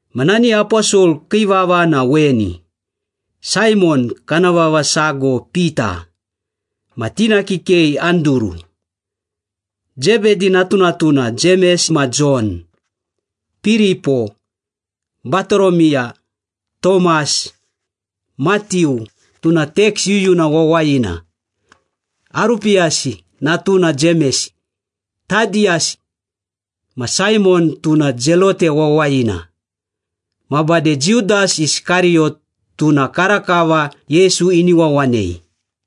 Ma nani aposol kii vava na weni. Saimon, kana vava sago Pita, ma tina kikei Anduru, Zebedi natunatuna Jemes ma Jon, Piripo, Batoromiya, Tomas, Matiu, tuna teks yuyuna wawayina, Arupiyasi natuna Jemes, Tadiyas, ma Saimon, tuna Zelote wawayina. Ma bade Judas Iskariyot, tuna karakava Yesu ini wawanei.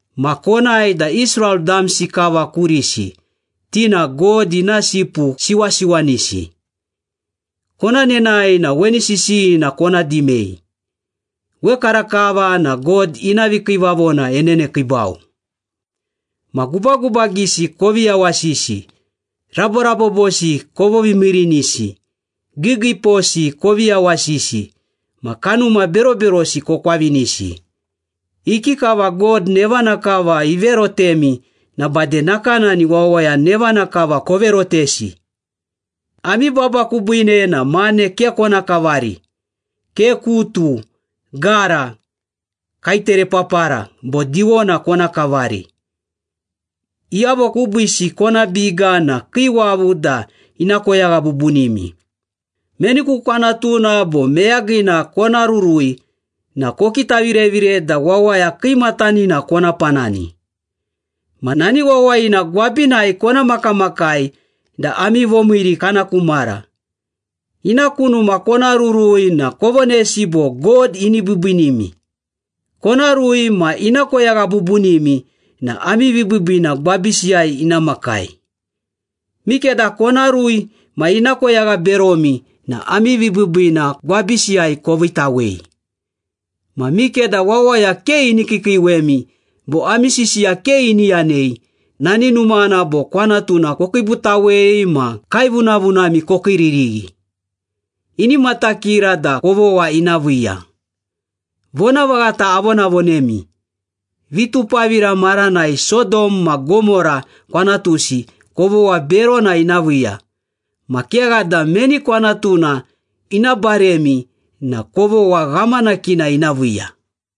Ma konae da Israel damsi kava kurisi, ti na God ina sipu siwasiwanisi. Kona nenae na weni sisiyina kona dimei. ‘Wekarakava na God ina vikiivavona enenekiibau.’ Ma gubagubagisi kovi yawasisi, raborabobosi kovovimiirinisi, giigiiposi kovi yawasisi ma kanuma beroberosi kokwavinisi. Ikikava God nevana kava iverotemi na bade nakanani wawaya nevana kava koverotesi. Ami baba kubiine na mane ke kona kavari, ke kutu, gara, kaeterepapara, bo diwona kona kavari. Iyavo kubiisi kona biga na kii wavu da ina koyagha bubunimi.” “Meni ku kwanatuna bo meyagina kona rurui na kokitavirevire da wawaya kiimatanina kona panani. Ma nani wawayina gwabinai kona makamakai da ami vomiiri kana ku mara. Ina ku numa kona rurui na kovonesi bo, ‘God ini biibiinimi.’ Kona rui ma ina koyagha bubunimi na ami vibiibiina gwabisiyai ina makai. Mikeda kona rui ma ina koyagha beromi na ami vibiibiina gwabisiyai koviitawei. Ma mikeda wawaya ke ini kiikiiwemi bo ami sisiya ke ini yanei, nani numana bo kwanatuna kokiibutawei ma kaevunavunami kokiiririghi, ini matakira da kovogha ina viiya. Vonavaghata avonavonemi, vitupavira maranai Sodom ma Gomora kwanatusi kovogha berona ina viiya, ma kegha da meni kwanatuna ina baremi na kovogha ghamanakina ina viiya.”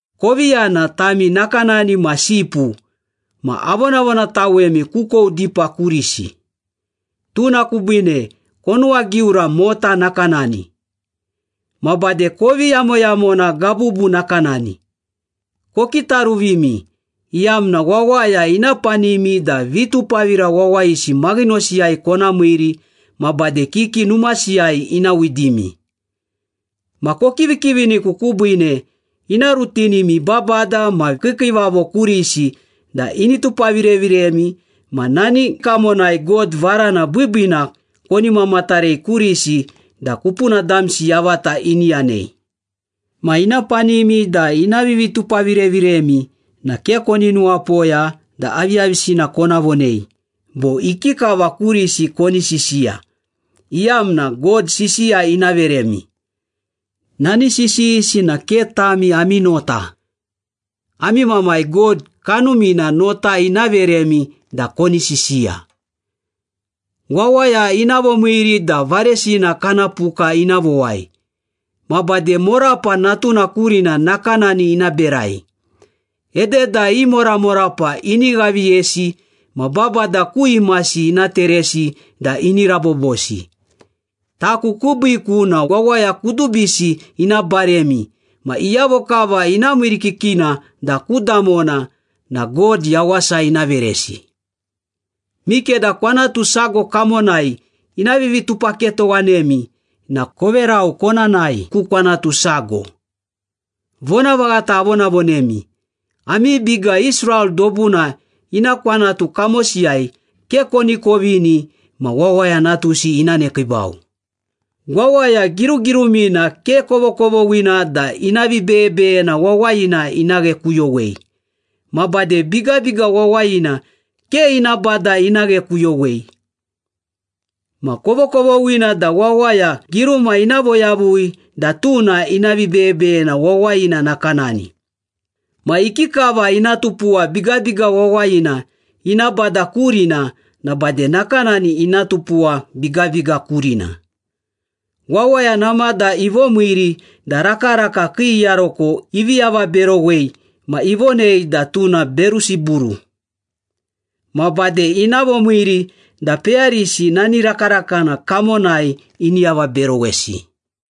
“Kovi yana, tami nakanani ma sipu ma avonavonatawemi kukou dipa kurisi. Tuna kubiine konuwagiura mota nakanani. Ma bade kovi yamoyamona gabubu nakanani. Kokitaruvimi, iyamna wawaya ina panimi da vitupavira wawayisi maghinosiyai kona miiri ma bade kiki numasiyai ina widimi. Ma kokivikiviniku kubiine ina rutinimi babada ma kiikiivavo kurisi da ini tupavireviremi ma nani kamonai God varana biibiina koni mamatarei kurisi da kupuna damsi yavata ini yanei. Ma ina panimi da ina vivitupavireviremi na ke koni nuwapoya da aviyavisina kona vonei bo ikikava kurisi koni sisiya, iyamna God sisiya ina veremi. Nani sisiyisi na ke tami ami nota, ami Mamai God Kanumina nota ina veremi da koni sisiya.” “Wawaya ina vomiiri da varesina kana puka ina vowai, ma bade morapa natuna kurina nakanani ina berai. Ededa i moramorapa ini ghaviyesi ma babada ku imasi ina teresi da ini rabobosi. Taku kubiiku na wawaya kudubisi ina baremi ma iyavo kava ina miirikikina da ku damona na God yawasa ina veresi. Mikeda kwanatu sago kamonai ina vivitupaketowanemi na koverau, kona nae ku kwanatu sago. Vonavaghata avonavonemi, ami biga Israel dobuna ina kwanatu kamosiyai ke koni kovini ma Wawaya Natusi ina nekiibau.” “Wawaya girugirumina ke kovokovoghina da ina vibeyebeyena wawayina ina ghekuyowei, ma bade bigabiga wawayina ke ina bada ina ghekuyowei. Ma kovokovoghina da wawaya giruma ina voyavui da tuna ina vibeyebeyena wawayina nakanani. Ma ikikava ina tupuwa bigabiga wawayina ina bada kurina na bade nakanani ina tupuwa bigabiga kurina. Wawaya namada ivomiiri da rakaraka kii iyaroko ivi avaberowei ma ivonei da tuna Berusiburu. Ma bade ina vomiiri da peyarisi nani rakarakana kamonai ini avaberowesi.”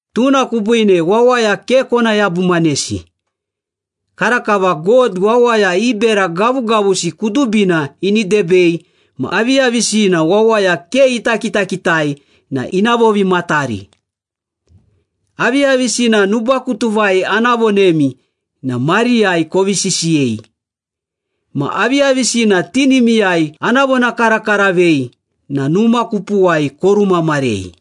“Tuna kubiine wawaya ke kona yabumanesi. Karakava God wawaya i bera gavugavusi kudubina ini debei ma aviyavisina wawaya ke ita kitakitai na ina vovimatari. Aviyavisina nubakutuvai ana vonemi na mariyai kovi sisiyei. Ma aviyavisina tinimiyai ana vonakarakaravei na numa kupuwai korumamarei.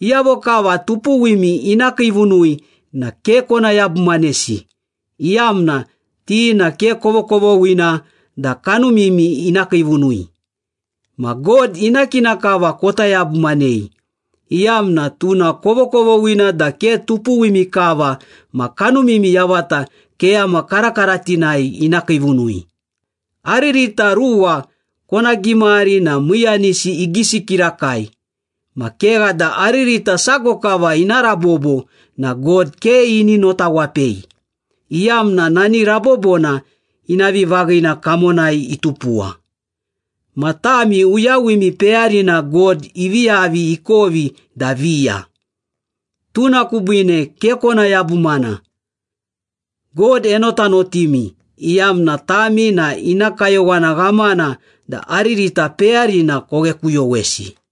Iyavo kava tupuwimi ina kiivunui na ke kona yabumanesi, iyamna ti na ke kovokovoghina da kanumimi ina kiivunui. Ma God ina kina kava kota yabumanei, iyamna tuna kovokovoghina da ke tupuwimi kava ma kanumimi yavata keyama karakaratinai ina kiivunui. Aririta ruwa kona gimari na miiyanisi igisi kirakai. Ma kegha da aririta sago kava ina rabobo na God ke ini notawapei, iyamna nani rabobona ina vivaghina kamonai itupuwa. Ma tami, uyawimi peyarina God ivi yavi ikovi da viya. Tuna kubiine ke kona yabumana. God enotanotimi, iyamna tami na ina kayowana ghamana da aririta peyarina koghekuyowesi.”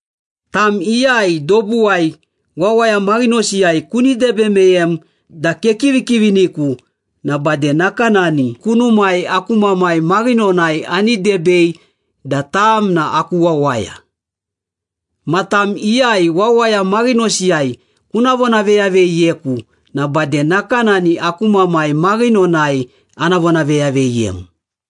“Tam iyai dobuwai, wawaya maghinosiyai kuni debe meyem da kekivikiviniku na bade nakanani kunumai, aku Mamai maghinonai ani debei da tam na aku wawaya. Ma tam iyai wawaya maghinosiyai kuna vonaveyaveyiyeku na bade nakanani aku Mamai maghinonai ana vonaveyaveyiyem.”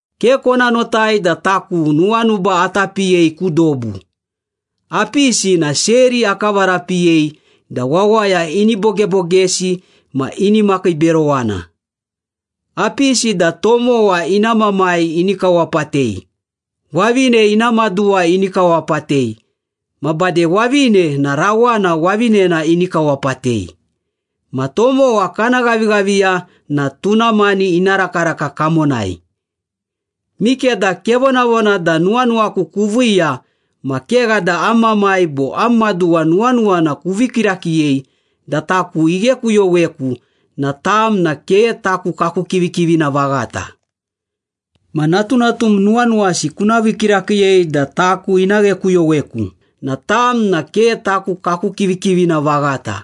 “Ke kona notai da taku nuwanuba ata piyei ku dobu. Apisi na seri akavarapiyei da wawaya ini bogebogesi ma ini makiiberowana. Apisi da tomowa ina mamai ini kawapatei, wavine ina maduwa ini kawapatei, ma bade wavine na rawana wavinena ini kawapatei. Ma tomowa kana ghavighaviya na tuna mani ina rakaraka kamonai.” “Mikeda kevonavona da nuwanuwaku kuviiya ma kegha da am mamai bo am maduwa nuwanuwana kuvii kirakiiyei da taku ighekuyoweku na tam na ke taku kaku kivikivina vaghata. Ma natunatum nuwanuwasi kuna vii kirakiiyei da taku ina ghekuyoweku na tam na ke taku kaku kivikivina vaghata.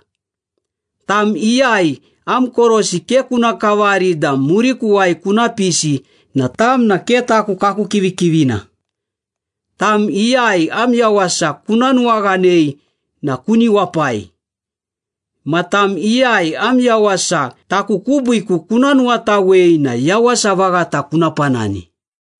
Tam iyai am korosi ke kuna kavari da murikuwai kuna pisi na tam na ke taku kaku kivikivina. Tam iyai am yawasa kuna nuwaghanei na kuni wapai. Ma tam iyai am yawasa taku kubiiku kuna nuwatawei na yawasa vaghata kuna panani.”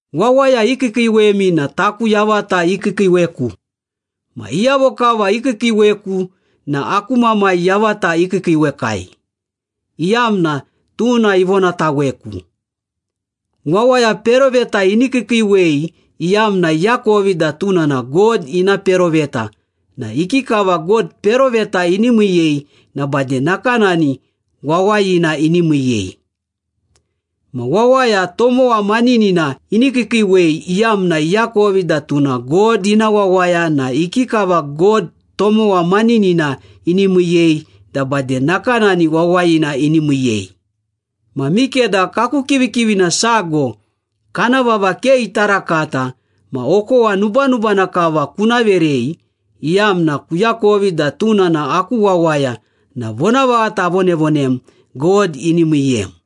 “Wawaya ikiikiiwemi na taku yavata ikiikiiweku. Ma iyavo kava ikiikiiweku na aku Mamai yavata ikiikiiwekai, iyamna tuna ivonataweku. Wawaya peroveta ini kiikiiwei iyamna iakovi da tuna na God ina peroveta na ikikava God peroveta ini miiyei na bade nakanani wawayina ini miiyei. Ma wawaya tomowa maninina ini kiikiiwei iyamna iakovi da tuna God ina wawaya na ikikava God tomowa maninina ini miiyei na bade nakanani wawayina ini miiyei. Ma mikeda kaku kivikivina sago, kana vava ke ita rakata ma okowa nubanubana kava kuna verei, iyamna kuakovi da tuna na aku wawaya na vonavaghata avonavonem, God ini miiyem.”